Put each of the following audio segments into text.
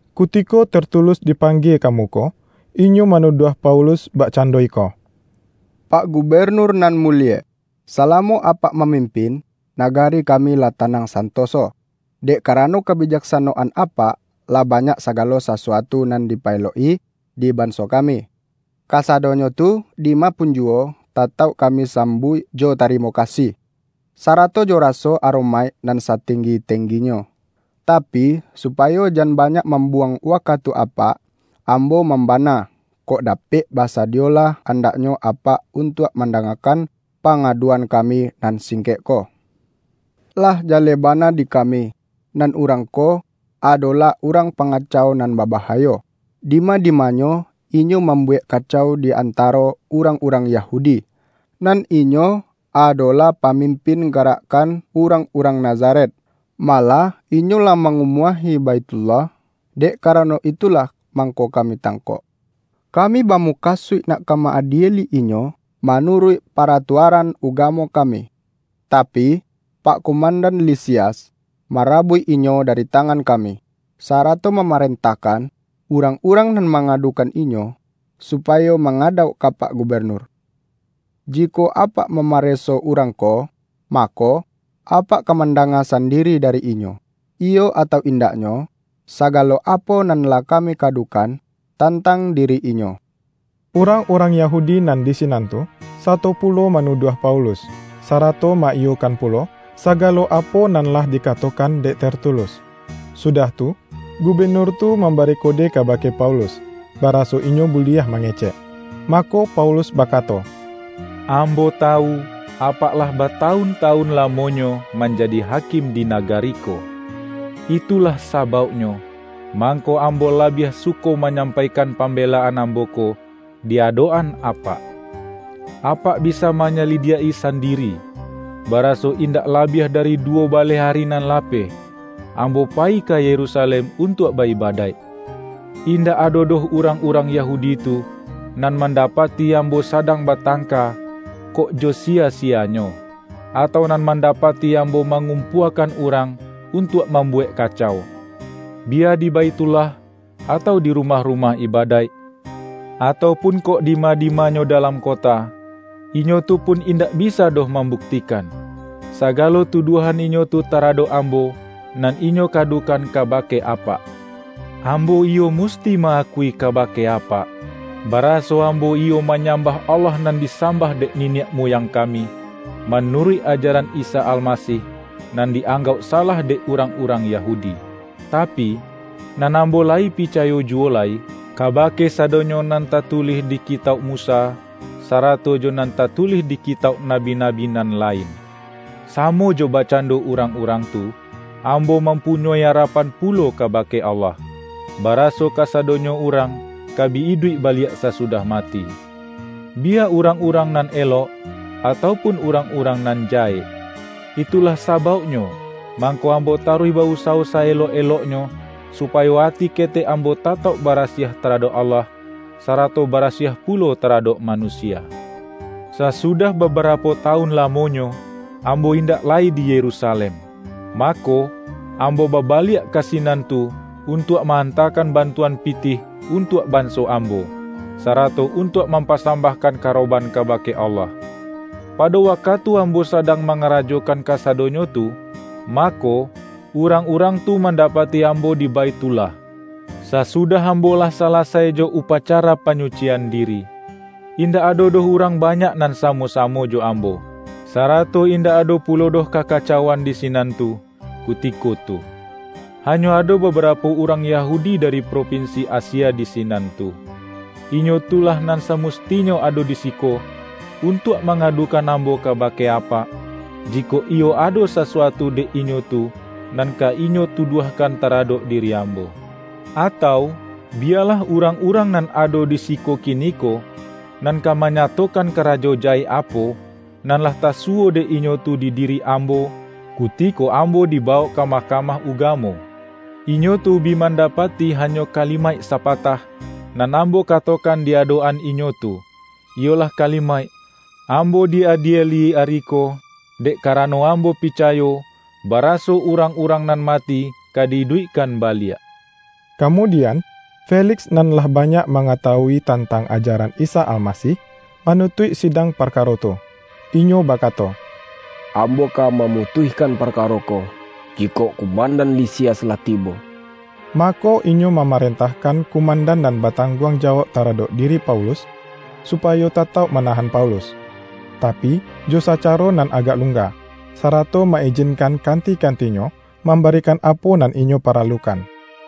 Kutiko Tertulus dipanggie ka muko, inyo manuduah Paulus bakcando iko,”Pak Gubenur nan mulie! Salamo apak mamimpin, nagari kami lah tanang santoso. Dek karano kabijaksanoan apak, lah banyak sagalo sasuatu nan dipaelok-i di banso kami. Kasadonyo tu, dima punjuwo, tatauk kami sambuik jo tarimo kasih, sarato jo raso aromaik nan satenggi-tengginyo. Tapi, supayo jan banyak mambuwang wakatu apak, ambo mambana, kok dapek basadiyolah andaknyo apak untuak mandangakan, pangaduan kami nan singkek ko. Lah jaleh bana di kami, nan urang ko, adolah urang pangacau nan babahayo. Dima-dimanyo inyo mambuwek kacau di antaro urang-urang Yahudi, nan inyo adolah pamimpin garakkan urang-urang Nazaret. Malah inyo lah mangumuahi Baithullah, dek karano itulah mangko kami tangkok. Kami bamukasuik nak ka ma-adieli inyo manuruik paratuaran ugamo kami. Tapi, pak kumandan Lisias, marabuik inyo dari tangan kami, sarato mamarentahkan, urang-urang nan mangadukan inyo, supayo mangadauk ka pak Gubenur. Jikok apak mamareso urang ko, mako, apak ka mandanga sandiri dari inyo, iyo atau indaknyo, sagalo apo nan lah kami kadukan, tantang diri inyo.” Urang-urang Yahudi nan di sinan tu, sato pulo manuduah Paulus, sarato ma-iyokan pulo sagalo apo nan lah dikatokan dek Tertulus. Sudah tu, gubenur tu mambari kode kabake Paulus, baraso inyo buliah mangecek. Mako, Paulus bakato,”Ambo tawu, apak lah batawun-tawun lamonyo manjadi hakim di nagari ko. Itulah sabauknyo, mangko ambo labiah suko manyampaikan pambelaan ambo ko, di adok-an apak. Apak bisa manyalidiak-i sandiri, baraso indak labiah dari duwo baleh ari nan lapeh, ambo payi ka Yerusalem untuak ba-ibadaik. Indak ado doh urang-urang Yahudi tu, nan mandapati ambo sadang batangka kok jo siya-siyanyo, atau nan mandapati ambo mangumpuakan urang untuak mambuwek kacau, biya di Baithullah, atau di rumah-rumah ibadaik, atau pun kok dima-dimanyo dalam kota. Inyo tu pun indak bisa doh mambuktikan, sagalo tuduahan inyo tu taradok ambo, nan inyo kadukan kabake apak. Ambo iyo musti ma-akui kabake apak, baraso ambo iyo manyambah Allah nan disambah dek niniak muyang kami, manuruik ajaran Isa Almasih, nan di-anggauk salah dek urang-urang Yahudi. Tapi, nan ambo layi picayo juwo lai, kabake sadonyo nan tatulih di Kitauk Musa, sarato jo nan tatulih di Kitauk Nabi-nabi nan lain. Samo jo bakcando urang-urang tu, ambo mampunyoi arapan pulo kabake Allah, baraso kasadonyo urang, ka bi iduik baliak sasudah mati — biya urang-urang nan elok, atau pun urang-urang nan jahek! Itulah sabauknyo mangko ambo taruih ba-usawo sa-elok-eloknyo, supayo ati ketek ambo tatauk barasiah taradok Allah, sarato barasiah pulo taradok manusia. Sasudah babarapo tawun lamonyo, ambo indak lai di Yerusalem, mako, ambo babaliak ka sinan tu untuak ma-antakan bantuan pitih untuak banso ambo, sarato untuak mampasambahkan karoban kabake Allah. Pado wakatu ambo sadang mangarajokan kasadonyo tu, mako, urang-urang tu mandapati ambo di Baithullah, sasudah ambo lah salasai jo upacara panyucian diri. Indak ado doh urang banyak nan samo-samo jo ambo, sarato indak ado pulo doh kakacauan di sinan tu, kutiko tu. Hanyo ado babarapo urang Yahudi dari propinsi Asia di sinan tu. Inyo tu lah nan samustinyo ado di siko, untuak mangadukan ambo kabake apak, jikok iyo ado sasuatu dek inyo tu, nan ka inyo tuduahkan taradok diri ambo. Atau biyalah urang-urang nan ado di siko kiniko, nan ka manyatokan karajo jahek apo, nan lah tasuwo dek inyo tu di diri ambo, kutiko ambo dibawok ka Mahkamah Ugamo. Inyo tu bi mandapati hanyo kalimaik sapatah, nan ambo katokan di adok-an inyo tu, iyolah kalimaik: Ambo di-adieli ari ko, dek karano ambo picayo, baraso urang-urang nan mati ka di-iduikkan baliak.” Kamudian, Feliks nan lah banyak mangatawui tantang ajaran Isa Almasih, manutuik sidang parkaro tu. Inyo bakato,”Ambo ka mamutuihkan parkaro ko, jikok kumandan Lisias lah tibo.” Mako, inyo mamarentahkan kumandan nan batangguang jawauk taradok diri Paulus, supayo tatauk manahan Paulus, tapi, jo sacaro nan agak lungga, sarato ma-ijinkan kanti-kantinyo mambarikan apo nan inyo paralukan.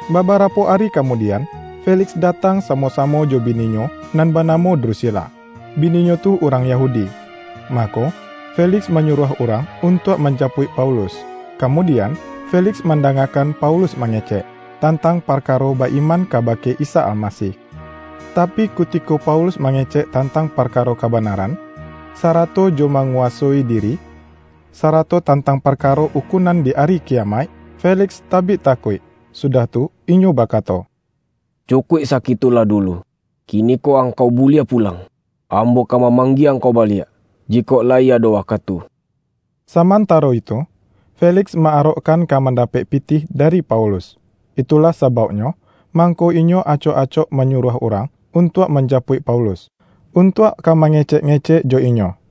Babarapo ari kamudian, Feliks datang samo-samo jo bininyo nan banamo Drusila; bininyo tu urang Yahudi. Mako, Feliks manyuruah urang untuak manjapuik Paulus, kamudian, Feliks mandangakan Paulus mangecek, tantang parkaro ba-iman kabake Isa Almasih. Tapi, kutiko Paulus mangecek tantang parkaro kabanaran, sarato jo manguwasoi diri, sarato tantang parkaro ukunan di Ari Kiyamaik, Feliks tabik takuik, sudah tu inyo bakato,”Cukuik sakitu lah dulu, kiniko angkau buliah pulang. Ambo ka mamanggie angkau baliak, jikok layi ado wakatu.” Samantaro itu, Feliks ma-arokkan ka mandapek pitih dari Paulus. Itulah sabauknyo, mangko inyo acok-acok manyuruah urang untuak manjapuik Paulus, untuak ka mangecek-ngecek jo inyo.